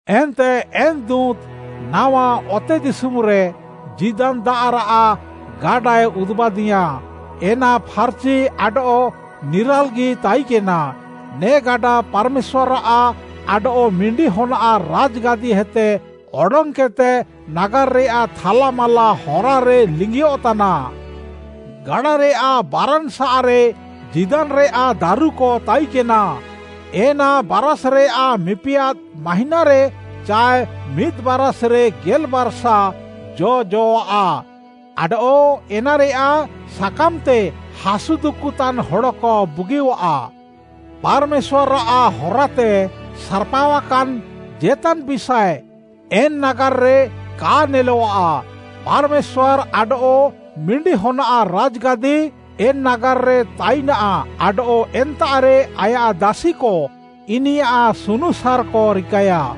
ଏନ୍ତେ ଏନ୍‌ ଦୁଁତ୍‌, ନାୱା ଅତେଦିଶୁମ୍‌ରେ ଜୀଦାନ୍‌ ଦାଆଃରାଃ ଗାଡ଼ାଏ ଉଦୁବାଦିୟାଁ, ଏନା ଫାର୍‌ଚି ଆଡଃ ନିରାଲ୍‌ଗି ତାଇକେନା। ନେ ଗାଡ଼ା ପାର୍‌ମେଶ୍ୱାର୍‌ଆଃ ଆଡଃ ମିଣ୍ଡି ହନ୍ଆଃ ରାଜ୍‌ଗାଦିହେତେ ଅଡଙ୍ଗ୍‌କେଦ୍‌ତେ, ନାଗାର୍‌ରେୟାଃ ଥାଲା ମାଲା ହରାରେ ଲିଙ୍ଗିୟଃତାନା। ଗାଡ଼ାରେୟାଃ ବାରାନ୍‌ ସାଃରେ ଜୀଦାନ୍‌ରେୟାଃ ଦାରୁକ ତାଇକେନା, ଏନା ବାରାଷ୍‌ରେୟାଃ ମିପିଆଦ୍‌ ମାହିଁନାରେ ଚାଏ ମିଦ୍‌ ବାରାଷ୍‌ରେ ଗେଲ୍‌ବାର୍‌ସାଃ ଜ'ଜଅଃଆ, ଆଡଃ ଏନାରେୟାଃ ସାକାମ୍‌ତେ ହାସୁ ଦୁକୁଃତାନ୍‌ ହଡ଼କ ବୁଗିୟଃଆ। ପାର୍‌ମେଶ୍ୱାର୍‌ଆଃ ହରାତେ ସାର୍‌ପାଅକାନ୍‌ ଜେତାନ୍‌ ବିଷାଏ ଏନ୍ ନାଗାର୍‌ରେ କା ନେଲଃଆ। ପାର୍‌ମେଶ୍ୱାର୍‌ ଆଡଃ ମିଣ୍ଡି ହନ୍‌ଆଃ ରାଜ୍‌ଗାଦି, ଏନ୍‌ ନାଗାର୍‌ରେ ତାଇନାଃ ଆଡଃ ଏନ୍ତାଃରେ ଆୟାଃ ଦାସିକ ଇନିୟାଃ ସୁନୁସାର୍‌କ ରିକାୟା।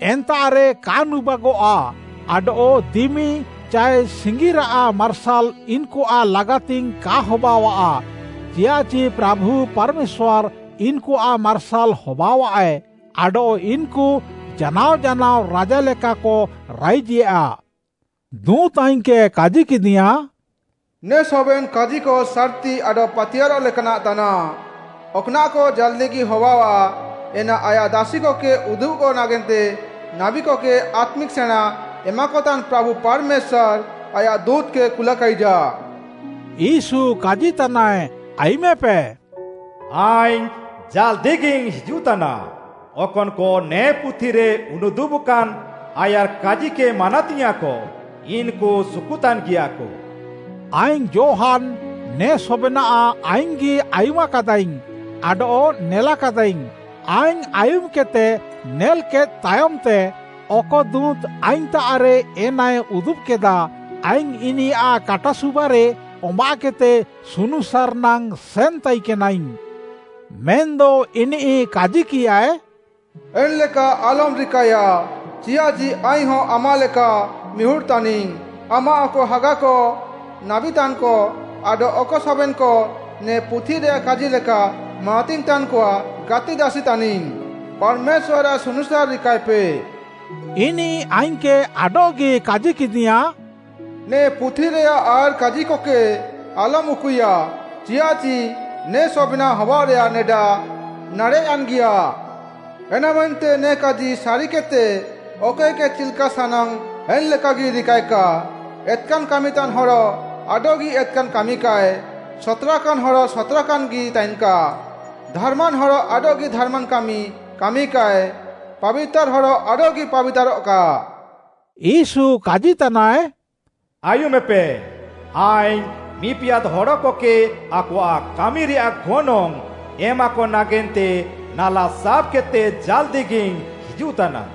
ଏନ୍ତାଃରେ କା ନୁବାଗଃଆ ଆଡଃ ଦିମି ଚାଏ ସିଙ୍ଗିରାଃ ମାର୍ସାଲ୍‌ ଇନ୍‌କୁଆଃ ଲାଗାତିଙ୍ଗ୍‌ କା ହବାଅଃଆ, ଚିୟାଃଚି ପ୍ରାଭୁ ପାର୍‌ମେଶ୍ୱାର୍‌ ଇନ୍‌କୁଆଃ ମାର୍ସାଲ୍‌ ହବାଅଃଆଏ ଆଡଃ ଇନ୍‌କୁ ଜାନାଅ ଜାନାଅ ରାଜା ଲେକାକ ରାଇଜେୟା। ଦୁଁତ୍‌ ଆଇଙ୍ଗ୍‌କେ କାଜିକେଦିୟାଁ, “ନେ ସବେନ୍‌ କାଜିକ ସାର୍‌ତି ଆଡଃ ପାତିୟାର୍‌ରଃ ଲେକାନାଃ ତାନାଃ। ଅକ୍‌ନାଃକ ଜାଲ୍‌ଦିଗି ହବାଅଃଆ, ଏନା ଆୟାଃ ଦାସିକକେ ଉଦୁବ୍‌କ ନାଗେନ୍ତେ ନାବୀକକେ ଆତ୍ମିକ୍‌ ସେଣାଁ ଏମାକତାନ୍‌ ପ୍ରାଭୁ ପାର୍‌ମେଶ୍ୱାର୍‌ ଆୟାଃ ଦୁଁତ୍‌କେ କୁଲାକାଇଜା।” ୟୀଶୁ କାଜିତାନାଏ ଆୟୁମେପେ, “ଆଇଙ୍ଗ୍‌ ଜାଲ୍‌ଦିଗିଇଙ୍ଗ୍‌ ହିଜୁଃତାନା, ଅକନ୍‌କ ନେ ପୁଥିରେ ଉନୁଦୁବ୍‌କାନ୍‌ ଆୟାର୍‌କାଜିକେ ମାନାତିୟାଁଃକ, ଇନ୍‌କୁ ସୁକୁତାନ୍‌ଗିୟାକ।” ଆଇଙ୍ଗ୍‌ ଯୋହାନ୍‌, ନେ ସବେନାଃ ଆଇଙ୍ଗ୍‌ଗି ଆୟୁମାକାଦାଇଙ୍ଗ୍‌ ଆଡଃ ନେଲାକାଦାଇଙ୍ଗ୍‌। ଆଇଙ୍ଗ୍‌ ଆୟୁମ୍‌କେଦ୍‌ତେ ନେଲ୍‍କେଦ୍‍ ତାୟମ୍‌ତେ, ଅକ ଦୁଁତ୍‌ ଆଇଙ୍ଗ୍‌ତାଃରେ ଏନାଏ ଉଦୁବ୍‌କେଦା, ଆଇଙ୍ଗ୍‌ ଇନିୟାଃ କାଟାସୁବାରେ ଅମ୍ବାଃକେଦ୍‌ତେ ସୁନୁସାର୍‌ ନାଙ୍ଗ୍‌ ସେନ୍‌ ତାଇକେନାଇଙ୍ଗ୍‌। ମେନ୍‌ଦ ଇନିଃ କାଜିକିୟାଁଏ, “ଏନ୍‌ଲେକା ଆଲମ୍‌ ରିକାଏୟା ଚିଆଃଚି ଆଇଙ୍ଗ୍‌ହଁ ଆମାଃ ଲେକା ମିହୁଡ଼୍‌ ତାନିଙ୍ଗ୍‌। ଆମାଃ ଅକ ହାଗାକ, ନାବୀତାନ୍‌କ ଆଡଃ ଅକ ସବେନ୍‌କ, ନେ ପୁଥିରେୟାଃ କାଜି ଲେକା ମାନାତିଙ୍ଗ୍‌ ତାନ୍‌କଆଃ ଗାତିଦାସି ତାନିଙ୍ଗ୍‌। ପାର୍‌ମେଶ୍ୱାର୍‌ଆଃ ସୁନୁସାର୍‌ ରିକାଇପେ।” ଇନିଃ ଆଇଙ୍ଗ୍‌କେ ଆଡଃଗି କାଜିକେଦିୟାଁ, “ନେ ପୁଥିରେୟାଃ ଆୟାର୍‌କାଜିକକେ ଆଲମ୍‌ ଉକୁଇୟା, ଚିୟାଃଚି ନେ ସବେନାଃ ହବାଅଃରେୟାଃ ନେଡା ନାଡ଼େଃ'ୟାନ୍‌ଗିୟା। ଏନାମେନ୍ତେ ନେ କାଜି ସାରିକେଦ୍‌ତେ, ଅକଏକେ ଚିଲ୍‌କା ସାନାଙ୍ଗ୍‌ ଏନ୍‌ଲେକାଗି ରିକାଏକା। ଏତ୍‌କାନ୍‌ କାମିତାନ୍‌ ହଡ଼ ଆଡଃଗି ଏତ୍‌କାନ୍‌ କାମିକାଏ, ସତ୍‌ରାକାନ୍‌ ହଡ଼ ସତ୍‌ରାକାନ୍‌ଗି ତାଇନ୍‌କା, ଧାର୍‌ମାନ୍‌ ହଡ଼ ଆଡଃଗି ଧାରାମ୍‌ କାମି କାମିକାଏ, ପାବିତାର୍‌ ହଡ଼ ଆଡଃଗି ପାବିତାର୍‌ରଃକା।” ୟୀଶୁ କାଜିତାନାଏ, “ଆୟୁମେପେ, ଆଇଙ୍ଗ୍‌ ମିପିଆଦ୍‌ ହଡ଼କକେ ଆକୱା କାମିରେୟାଃ ଗନଙ୍ଗ୍‌ ଏମାକ ନାଗେନ୍ତେ ନାଲା ସାବ୍‌କେଦ୍‌ତେ ଜାଲ୍‌ଦିଗିଇଙ୍ଗ୍‌ ହିଜୁଃତାନା।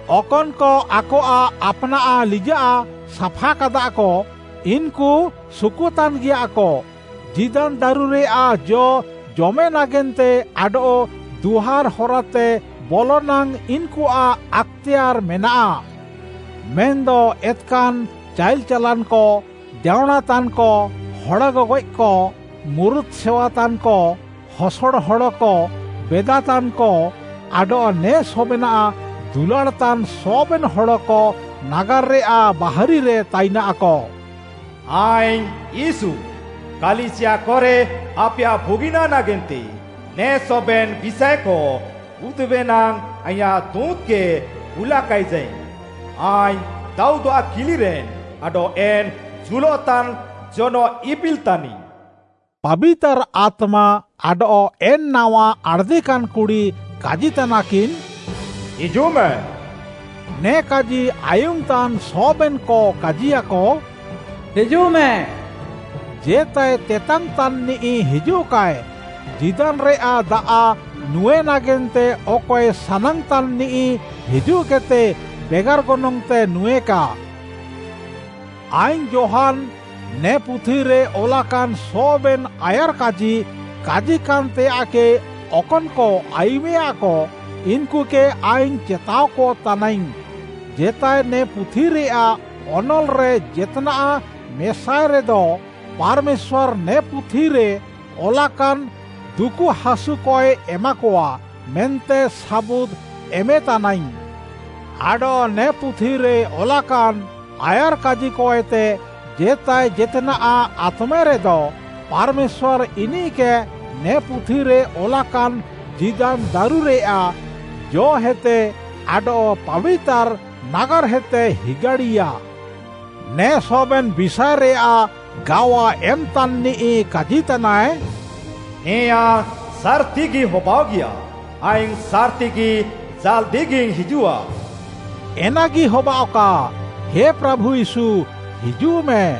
ଅକନ୍‌କ ଆକଆଃ ଆପ୍‌ନାଃ ଲିଜାଃ ସାଫାକାଦାକ, ଇନ୍‌କୁ ସୁକୁତାନ୍‌ଗିୟାକ। ଜୀଦାନ୍‌ ଦାରୁରେୟାଃ ଜ ଜମେ ନାଗେନ୍ତେ ଆଡଃ ଦୁଆର୍‌ ହରାତେ ବଲ ନାଙ୍ଗ୍‌ ଇନ୍‌କୁଆଃ ଆକ୍‌ତେୟାର୍‌ ମେନାଃ। ମେନ୍‌ଦ ଏତ୍‌କାନ୍‌ ଚାଇଲ୍‌ ଚାଲାନ୍‌କ, ଦେଅଁଣାତାନ୍‌କ, ହଡ଼ ଗଗଏଃକ, ମୁରୁତ୍‌ ସେୱାତାନ୍‌କ, ହସଡ଼ ହଡ଼କ, ବେଦାତାନ୍‌କ, ଆଡଃ ନେ ସବେନାଃ ଦୁଲାଡ଼୍‌ତାନ୍‌ ସବେନ୍‌ ହଡ଼କ ନାଗାର୍‌ରେୟାଃ ବାହାରିରେ ତାଇନାକ। “ଆଇଙ୍ଗ୍‌ ୟୀଶୁ, କାଲିସିୟାକରେ ଆପେୟାଃ ବୁଗିନାଃ ନାଗେନ୍ତେ ନେ ସବେନ୍‌ ବିଷାଏକ ଉଦୁବେ ନାଙ୍ଗ୍‌ ଆଇଁୟାଃ ଦୁଁତ୍‌କେ କୁଲାକାଇଜାଇଙ୍ଗ୍‌। ଆଇଙ୍ଗ୍‌ ଦାଉଦ୍‌ଆଃ କିଲିରେନ୍‌, ଆଡଃ ଏନ୍‌ ଜୁଲଃତାନ୍‌ ଜନଃଇପିଲ୍‌ ତାନିଙ୍ଗ୍‌।” ପାବିତାର୍‌ ଆତ୍ମା ଆଡଃ ଏନ୍‌ ନାୱା ଆଣ୍‌ଦିକାନ୍‌ କୁଡ଼ି କାଜିତାନାକିନ୍, “ହିଜୁଃମେ,” ନେ କାଜି ଆୟୁମ୍‍ତାନ୍‌ ସବେନ୍‌କ କାଜିୟାକ, “ହିଜୁଃମେ,” ଜେତାଏ ତେତାଙ୍ଗ୍‌ତାନ୍‌ନିଃ ହିଜୁଃକାଏ। ଜୀଦାନ୍‌ରେୟାଃ ଦାଆଃ ନୁଁଏ ନାଗେନ୍ତେ ଅକଏ ସାନାଙ୍ଗ୍‌ତାନ୍‌ନିଃ ହିଜୁଃକେଦ୍‌ତେ ବେଗାର୍‌ ଗନଙ୍ଗ୍‌ତେ ନୁଁଏକା। ଆଇଙ୍ଗ୍‌ ଯୋହାନ୍‌, ନେ ପୁଥିରେ ଅଲାକାନ୍‌ ସବେନ୍‌ ଆୟାର୍‌କାଜି କାଜିକାନ୍‌ତେୟାଃକେ ଅକନ୍‌କ ଆୟୁମେୟାକ, ଇନ୍‌କୁକେ ଆଇଙ୍ଗ୍‌ ଚେତାଅକ ତାନାଇଙ୍ଗ୍‌, ଜେତାଏ ନେ ପୁଥିରେୟାଃ ଅନଲ୍‌ରେ ଜେତ୍‌ନାଃ ମେସାଏ ରେଦ, ପାର୍‌ମେଶ୍ୱାର୍‌ ନେ ପୁଥିରେ ଅଲାକାନ୍‌ ଦୁକୁହାସୁକଏ ଏମାକଆ, ମେନ୍ତେ ସାବୁଦ୍‌ ଏମେତାନାଇଙ୍ଗ୍‌। ଆଡଃ ନେ ପୁଥିରେ ଅଲାକାନ୍‌ ଆୟାର୍‍କାଜିକଏତେ ଜେତାଏ ଜେତ୍‌ନାଃ ଆତ୍‌ମେରେଦ, ପାର୍‌ମେଶ୍ୱାର୍‌ ଇନିଃକେ ନେ ପୁଥିରେ ଅଲାକାନ୍‌ ଜୀଦାନ୍‌ ଦାରୁରେୟାଃ ଜ'ହେତେ ଆଡଃ ପାବିତାର୍‌ ନାଗାର୍‌ହେତେ ହିଗାଡ଼ିୟା। ନେ ସବେନ୍‌ ବିଷାଏରେୟାଃ ଗାୱା ଏମ୍‌ତାନ୍‌ନିଃ କାଜିତାନାଏ, “ନେଆଁ ସାର୍‌ତିଗି ହବାଅଃଗିୟା। ଆଇଙ୍ଗ୍‌ ସାର୍‌ତିଗି ଜାଲ୍‌ଦିଗିଇଙ୍ଗ୍‌ ହିଜୁଃଆ।” ଏନାଗି ହବାଅଃକା। ହେ ପ୍ରାଭୁ ୟୀଶୁ, ହିଜୁଃମେ।